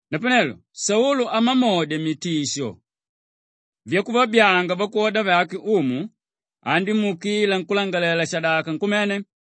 Napanelo Saulu amamodya mitisho yakuvabyaanga vakwoda vake Umu andímuukila nkúlangalalela-shadaka nkumene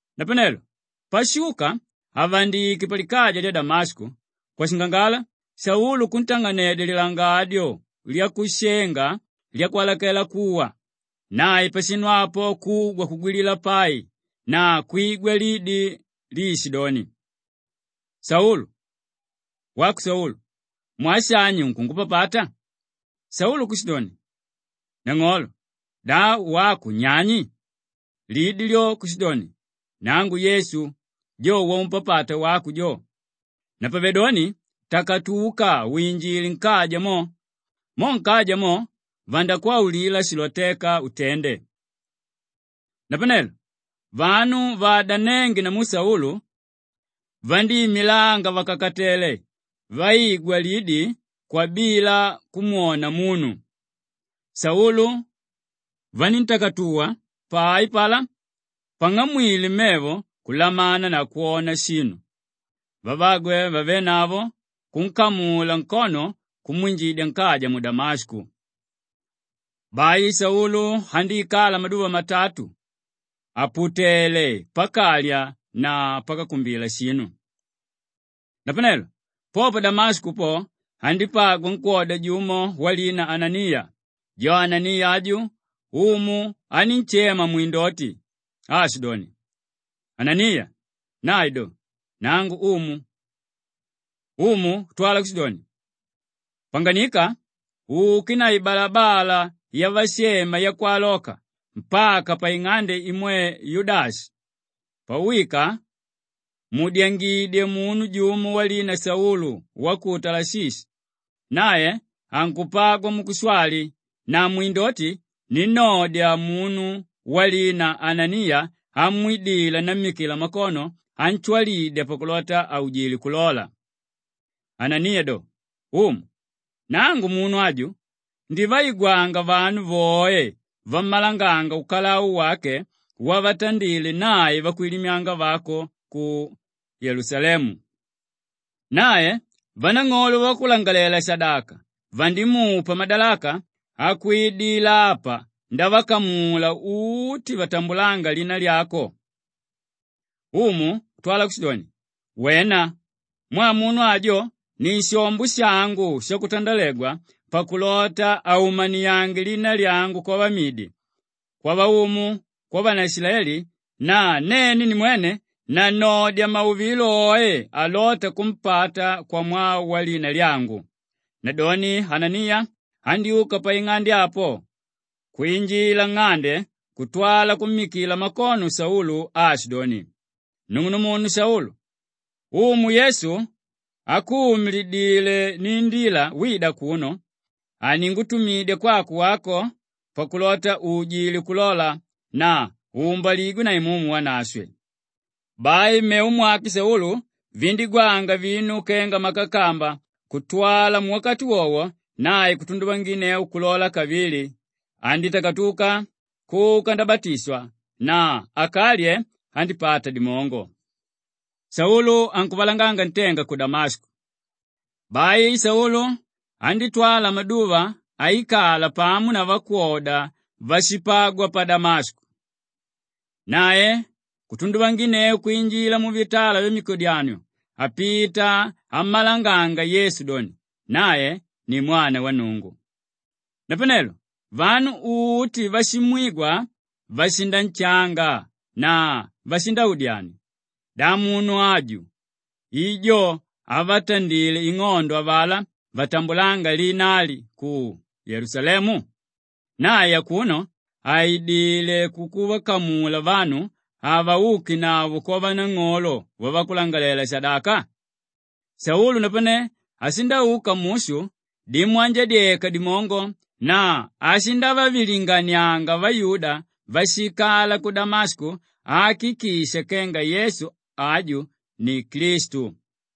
Napanelo pashuka àvandike palikaja lya Damashiko, kwashingangala Saulu kuntang'anedya lilangadyo lyakushenga lyakwalakela kuwa. Nae pashinu apo kugwa kugwilila pai na kwigwa lidi líishidoni, “Saulu, wako Saulu! Mwaa shani unkungupapata?” Saulu kushidoni, “Nang'olo, da wako unyani?” Lidi lyo kushidoni, “Nangu Yesu, jo waumpapata wako jo. Napavedoni takatuka winjile nkaja mo! Mo nkaja mo, vandakwaulila shilotéka utende.” Napanelo vanu vaadanénge namu Saulu vandíimilanga vàkakatele vaigwa lidi kwabila kumwona munu. Saulu vaníntakatuwa pai apalá, pang'amwile mevo kulamana na kwona shinu; vavagwe vavénavo kunkamula nkono kumwinjidya nkaja mu Damashiko. Bai Saulu andíikala maduva matatu àputele pakalya na pakakumbila shinu. Napanelo po pa Damashiko po, andípagwa nkwóda jumo walina Ananiya; jo Ananiya aju Umu anínshema mwindoti aashidoni, “Ananiya!” Nae doni, “Nangu Umu!” Umu kutwala kushidoni, “Panganika uke na ibalabala yavashema Yakwaloka mpaka paing'ande imwe Yudashi; pauwika, muudyangidye munu jumo walina Saulu wa ku Talashishi; nae ankupagwa mukushwali na mwindoti ninnodya munu walina Ananiya amwidila nammikila makono anshwalidya pakulota aujile kulola.” Ananiya do, “Umu, nangu munu aju ndivaigwanga vanu voe vammalanganga ukalau wake wavatandile nae vakwilimyanga vako ku Yelusalemu. Nae vanang'olo vavakulangalalela-shadaka vandimupa madalaka akwidila apa ndavakamula uti vatambulánga lina lyako.” Umu kutwala kushidoni, “Wena! Mwaa munu ajo ni shombo shangu shakutandalegwa pakulota aumaniange lina lyangu kwavamidi, kwavaumu, kwavanaishilaeli na nene nimwene nannodya mauvilo oe álota kumpata kwamwaa walina lyangu.” Nadoni Ananiya andyúka paing'ande apo kwinjila nng'ande kutwala kummikila makono Saulu aashidoni, “Nung'unumunu Saulu, Umu Yesu ákuumililidile niindila wida akuno, aningutumidya kwako wako pakulota uujile kulola na uumbaligwe na Imumu Wanashwe.” Bai mmevo mwake Saulu vindígwanga vinu kenga makakamba kutwala muwakati wowo nae kutunduvanginneu kulola kavili; andítakatuka kuka ndabatishwa na akalye, andípata dimongo. Saulu ankuvalanganga ntenga ku Damashiko Bai Saulu andítwala maduva aikala pamo na vakwoda váshipagwa pa Damashiko. Nae kutunduvanginneu kwinjila muvitala vyamikodyanio apita ammalanganga Yesu doni, “Nae ni Mwana wa Nnungu.” Napanelo vanu uti váshimwigwa vashinanshanga na vashindaudyania, “Da munu aju i jo ávatandile ing'ondo avalá vatambulánga lina ali ku Yelusalemu? Nae akuno aidilé kukuvakamula vanu avaukenavo kwavanang'olo vavakulangalalela-shadaka?” Saulu napane ashindauka mushu dimwanjadyeka dimongo na ashindavavilinganianga vayuda váshiikala ku Damashiko aakikisha kenga Yesu aju ni Klistu.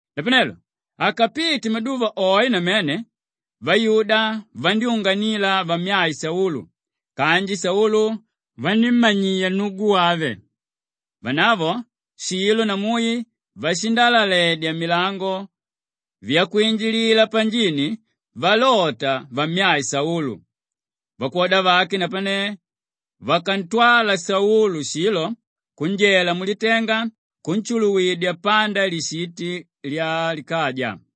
Napanelo akapite maduva oe namene, vayuda vandyúnganila vamyae Saulu kanji Saulu vanímmanyia nnugu wave. Vanavo shilo na mui vashindalaledya milango vyakwinjilila panjini valota vammyae Saulu. Vakwoda vake napane vakantwala Saulu shilo kunjela mulitenga kunshuluwidya panda lishiti lyalikaja.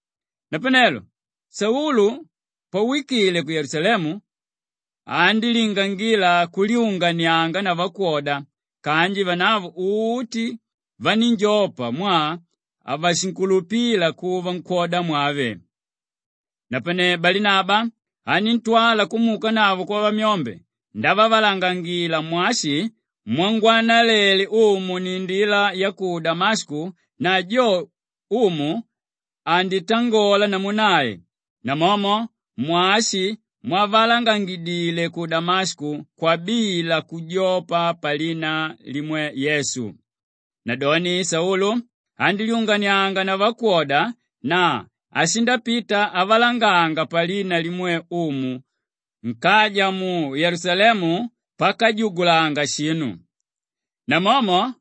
Napanelo Saulu pawikile ku Yelusalemu, andílingangila kulyunganianga na vakwoda kanji vanavo uti vanínjopa mwaa havashinkulupila kuva nkwódamwave. Napane Balinaba aníntwala kumuukanavo kwavamyombe ndavavalangangila mwashi mwangwanalele Umu niindila ya ku Damashiko na jo Umu anditangola namu nae, namomo mwashi mwavalangangidile ku Damashiko kwabila kujopa palina limwe Yesu. Nadoni Saulu andílyunganianga na vakwoda na ashindapita avalanganga palina limwe Umu nkaja mu Yelusalemu pakajugulanga shinu. Namomo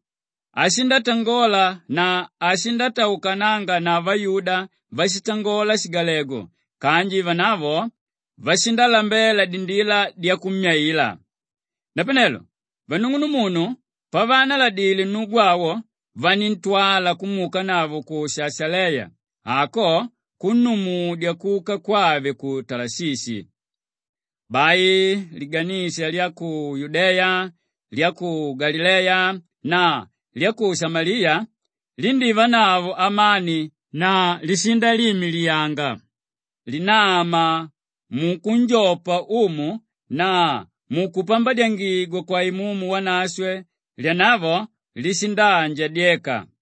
ashindatangola na ashindataukananga na vayuda váshitangola shigalegu kanji vanavo vashindalambela dindila dyakummyaila. Napanelo vanung'unumunu pavaanaladile nnugu awo vaníntwala kumuukanavo ku Shashaleya, ako kunnumudya kuka kwave ku Talashishi. Bai liganisha lya ku Yudeya, lya ku Galileya na lya ku Shamaliya lindívanavo amani na lishindaliimiliyanga; linama mukunjopa Umu na mukumpambadyangigwa kwa Imumu Wanashwe, lyanavo lishindaanjadyeka.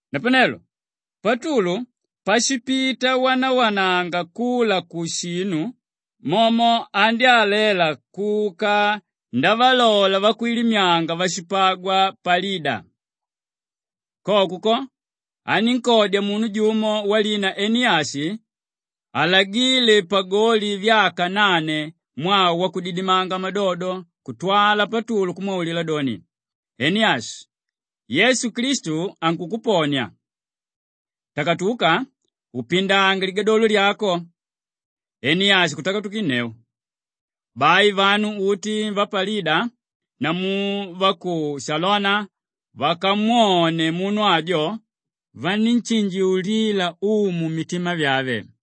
Napanelo Patulu pashipita awanawananga kula kushinu momo andyálela kuka ndavalola vakwilimyanga váshipagwa pa Lida. Koko ko, anínkodya munu jumo walina Eniyashi alagíle pagoli vyaka nane mwaa wakudidimanga madodo kutwala Patulu kumwaulila doni, “Eniyashi! Yesu Klistu ankukuponia. Takatuka upindange litandiko lyako!” Eniyashi kutakatukinneu. Bai vanu uti va pa Lida namu va ku Shalona vakamwone munu ajo, vanínshinjiulila Umu mitima vyave.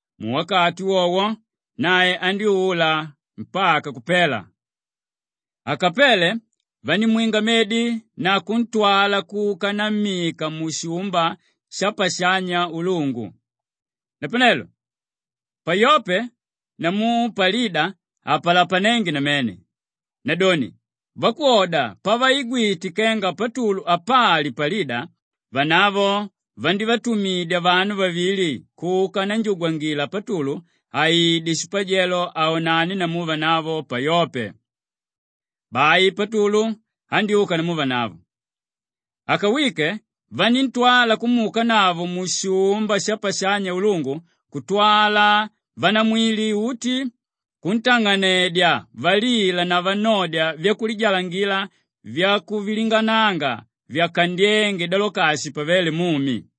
Muwakati wowo nae andyúula mpaka kupela. Akapele vandímwinga medi na kuntwala kuka nammika mushumba shapashanya ulungu. Napanelo pa Yope namu pa Lida hapalapanénge namene; nadoni, vakwoda pavaigwite kenga Patulu apali pa Lida vanavo vandívatumidya vanu vavili kuka nanjugwangila Patulu aide shipajelo aonane namu vanavo pa Yope. Bai Patulu andyúka namu vanavo. Akawike, vaníntwala kumuukanavo mushumba shapashanya ulungu kutwala vanamwili uti kuntang'anedya valila na vannodya vyakulijalangila vyakuvilingananga vyakandyénge Dolakashi pavéle mumi.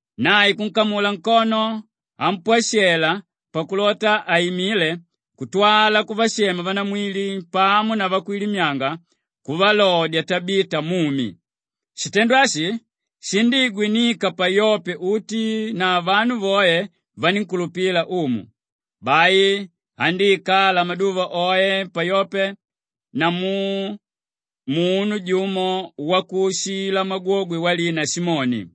Nae kunkamula nkono ampwashela pakulota aimile kutwala kuvashema vanamwili pamo na vakwilimyanga kuvalodya Tabita mumi. Shitendo ashi shindíigwinika pa Yope uti na vanu voe vanínkulupila Umu. Bai andíikala maduva oe pa Yope namu munu jumo wakuushila magwogwe walina Simoni.